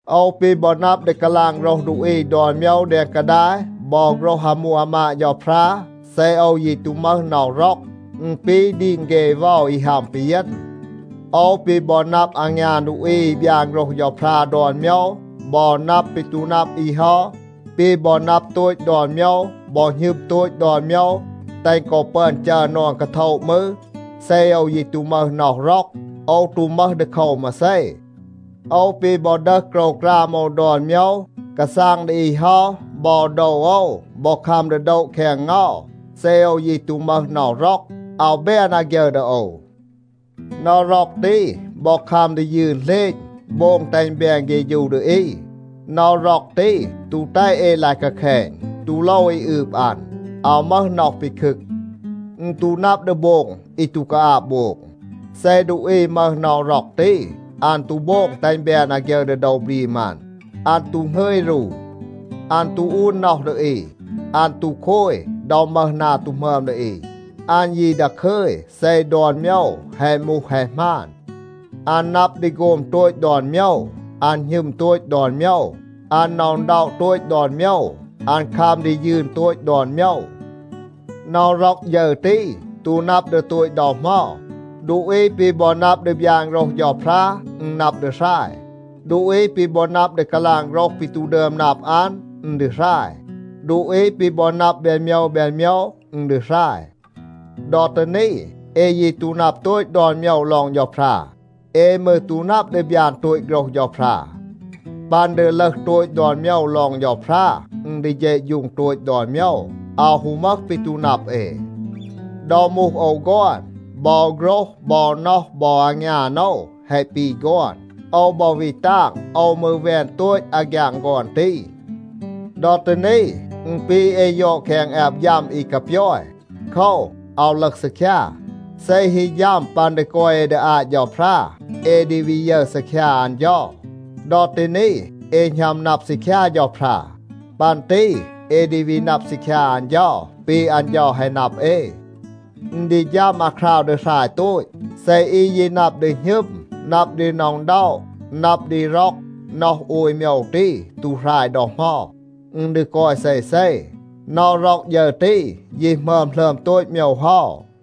โอว ปี บอ นับ ดี กาลาง โฆรห ดูอี ดอน โมยว แดง กาดาย บอ โฆรห อามู อามาด เฌาพรา, เซ โอว ยี ตู มึห น็อห ร็อก, อึณ ปี ดีง เฆ เวา อี ฮัม ปีเยณ. โอว ปี บอ นับ อางยาน ดูอี อี บยาน โฆรห เฌาพรา ดอน โมยว บอ นับ ปี ตู นับ อี เฮา, ปี บอ นับ โตต ดอน โมยว บอ หณึม โตต ดอน โมยว แตห กอ ปึอน จัร นอน กาโทะ มืร, เซ โอว ยี ตู มึห น็อห ร็อก, โอว ตู มึห ดีโคว มาเซ. โอว ปี บอ ดึห โกรวกราม โอว ดอน โมยว, กาซาง ดี อี เฮา บอ โดว โอว บอ คัม ดี โดะ แคง เงา, เซ โอว ยี ตู มึห น็อห ร็อก, อาว แบน อาฆยึร ดี โอว. น็อห ร็อก ตี บอ คัม ดี ยืน เหลณ, โบง แตห อึณ แบน เฆฌู ดี อี. น็อห ร็อก ตี ตู แตห เอ ลาย กาแคณ, ตู โลว อี อืบ อัน. อาว มึห น็อห ปีคึก. อึณ ตู นับ ดี โบง อี ตู กาอาบ โบง. เซ ดูอี มึห น็อห ร็อก ตี, อัน ตู โบง แตห อึณ แบน อาฆยึร ดี โดว บรีม อัน. อัน ตู หงึย รู. อัน ตู อูน น็อห ดี อี. อัน ตู โคย ดอ มึห นา ตู หมึอม ดี อี. อัน ยี ดาคึย เซ ดอน โมยว แฮะ มูห แฮะ หมาน. อัน นับ ดี โฆม โตต ดอน โมยว. อัน หณึม โตต ดอน โมยว. อัน หน็อะ อึณด็อะ โตต ดอน โมยว. อัน คัม ดี ยืน โตต ดอน โมยว. น็อห ร็อก ฌึร ตี ตู นับ ดี โตต ดอ เหมา. ดูอี ปี บอ นับ ดี บยาน โฆรห เฌาพรา, อึณ นับ ดี หราย. ดูอี ปี บอ นับ ดี กาลาง โฆรห ปี ตู ดึอม นับ อัน, อึณ ดี หราย. ดูอี ปี บอ นับ แบน โมยว แบน โมยว, อึณ ดี หราย. ดอ ตี นี, เอ ยี ตู นับ โตต ดอน โมยว ลอง เฌาพรา. เอ มืร ตู นับ ดี บยาน โตต โฆรห เฌาพรา. ปัน ดี ลึห โตต ดอน โมยว ลอง เฌาพรา, อึณ ดี เฌะฌูง โตต ดอน โมยว, อาว ฮู มึห ปี ตู นับ เอ. ดอ มูห โอว ฆอน, บอ โฆรห บอ น็อห บอ อางยาน โอว แฮะ ปี ฆอน. โอว บอ วี ตาง, โอว มืร แวน โตต อาฆยาง ฆอน ตี. ดอ ตี นี, อึณ ปี เอ ยอด แคง แอบ ฌัม อี กาปยอย. โคว, อาว ลึห ซีคยา. เซ ฮี ฌัม ปัน ดี กอย เอ ดี อาต เฌาพรา, เอ ดี วี ยึร ซีคยา อัน เฌา. ดอ ตี นี, เอ หณัม นับ ซีคยา เฌาพรา. ปัน ตี เอ ดี วี นับ ซีคยา อัน เฌา ปี อัน เฌา แฮะ นับ เอ. อึณ ดี ฌัม อาคราว ดี หราย โตต. เซ อี ยี นับ ดี หณึม, นับ ดี หน็อะ อึณด็อะ, นับ ดี ร็อก, น็อห โอย โมยว ตี, ตู หราย ดอ เหมา. อึณ ดี กอย เซเซ. น็อห ร็อก ฌึร ตี, ยี หมึอม หลึอม โตต โมยว เฮา.